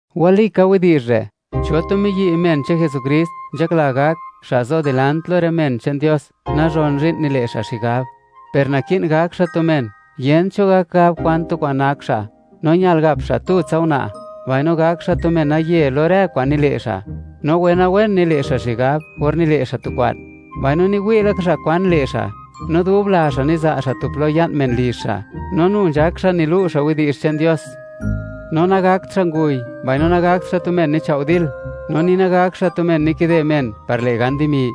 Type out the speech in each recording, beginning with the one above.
Walika widi'zh re': Cho tu miyi', men che'n Jesukrist, nzhakla gak, xa' zo dilant lo rë men che'n Dios, nazhon zhi'n nile' xa' xigab. Per, naki'n gak xa' tu men, yent cho gak gab kwan tu kwa'n nak xa'; no ñal gap xa' tutsa una', mbaino gak xa' tu menaye lo rë kwa'n nile' xa', no wenawen nile' xa' xigab or nile' xa' tu kwa'n, mbaino niwi' laka xa' kwan le' xa'; no dub la xa' niza' xa' tu plo ya'n men lizh xa', no nu nzhak xa' nilu' xa' widi'zh che'n Dios. No nagakt xa' nguy, mbaino nagakt xa' tu men nichao' dil, no ni nagakt xa' tu men nikide men par le' gan dimi;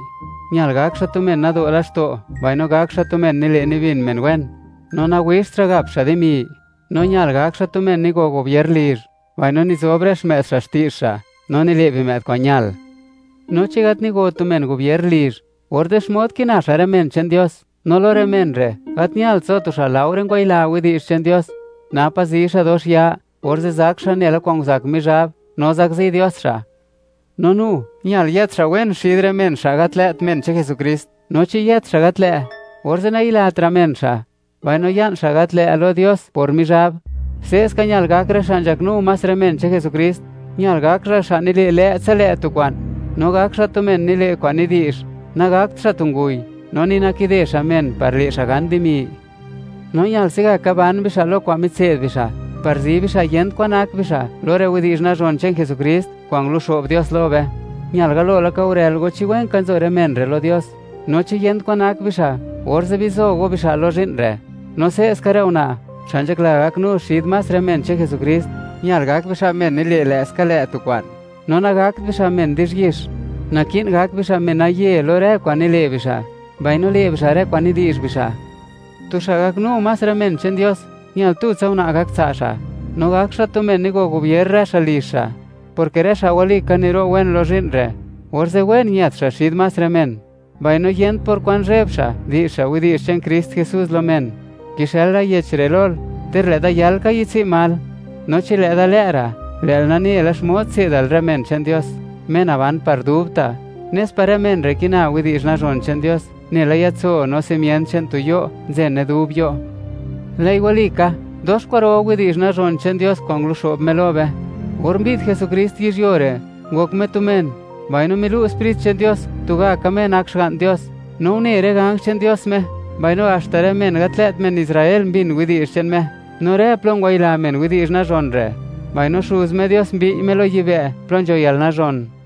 ñal gak xa' tu men nado' laxto' mbaino gak xa' tu men nile' nibin men wen; no nawixt xa' gap xa' dimi. No ñal gak xa' tu men nigo gobier lizh, mbaino nizob rë xmë'd xa' xti'zh xa' no nile' bimë'd kwa'n ñal. No chi gat nigo tu men gobier lizh, orze', ¿xmod kina xa' rë men che'n Dios? No lo rë men re', gat ñalt zo tu xa' laore ngwayila widi'zh che'n Dios, napa' zi xa' dox ya, orze' zak xa' nela kwa'n nguzak Mizhab, no zakzi Dios xa'. No nu, ñal yët xa' wen xid rë men xa' gat lë't men che'n Jesukrist, no chi yët xa' gat lë', orze' nayilatra' men xa', mbaino ya'n xa' gat lë' lo Dios por Mizhab. Se'ska ñal gak rë xa' nzhaknu más rë men che'n Jesukrist: Ñal gak xa', xa' nile' lë'ska lë' tu kwa'n, no gak xa' tu men nile' kwa'n nidi'zh; nagakt xa' tu nguy, no ni nakide xa' men par le' xa' gan dimi. No ñal se'gaka ban bixa' lo kwa'n mitse'd bixa', par zi bixa' yent kwan nak bixa' lo rë widi'zh nazhon che'n Jesukrist kwa'n nguluxo'b Dios lo be. Ñal galo laka gurël go chi wen ka nzo rë men re' lo Dios, no chi yent kwan nak bixa', orze' bizo go bixa' lo zhi'n re'. No se'ska rë una', xa' nzhakla gaknu xid más rë men che'n Jesukrist, ñal gak bixa' men nile' lë'ska lë' tu kwa'n, no nagakt bixa' men di'zhyix; naki'n gak bixa' menaye lo rë kwa'n nile' bixa', mbaino le' bixa' rë kwa'n nidi'zh bixa'. Tu xa' gaknu más rë men che'n Dios, ñal tutsa una' gak tsa' xa', no gak xa' tu men nigo gobier rë xa' lizh xa', porke rë xa' walika niro' wen lo zhi'n re', orze' wen ñët xa' xid más rë men, mbaino yent por kwan zheb xa' di'zh xa' widi'zh che'n Krist Jesús lo men. Kixëla yech re' lol, ter lë' da yal ka yi'dtsi'n mal, no chi lë' da lë' ra', lë'l nane la xmod tse'dal rë men che'n Dios, Me naban par dubta', nes par rë men re' kina widi'zh nazhon che'n Dios, nela yatso no simient che'n tu yuo' nzene dub yuo'. Lë'i walika, dox kwa'ro widi'zh nazhon che'n Dios kwa'n nguluxo'b Me lo be: Or mbi'd Jesukrist yizhyuo re', ngok Me tu men, mbaino milu' Sprit che'n Dios, tugaka Me nak Xga'n Dios, no une rë ganj che'n Dios Me, mbaino haxta rë men gat lë't men Israel mbin widi'zh che'n Me. No rë plo ngwayila men widi'zh nazhon re', mbaino Xuz Me Dios mbi'y Me lo yibë' plo nzho yalnazhon.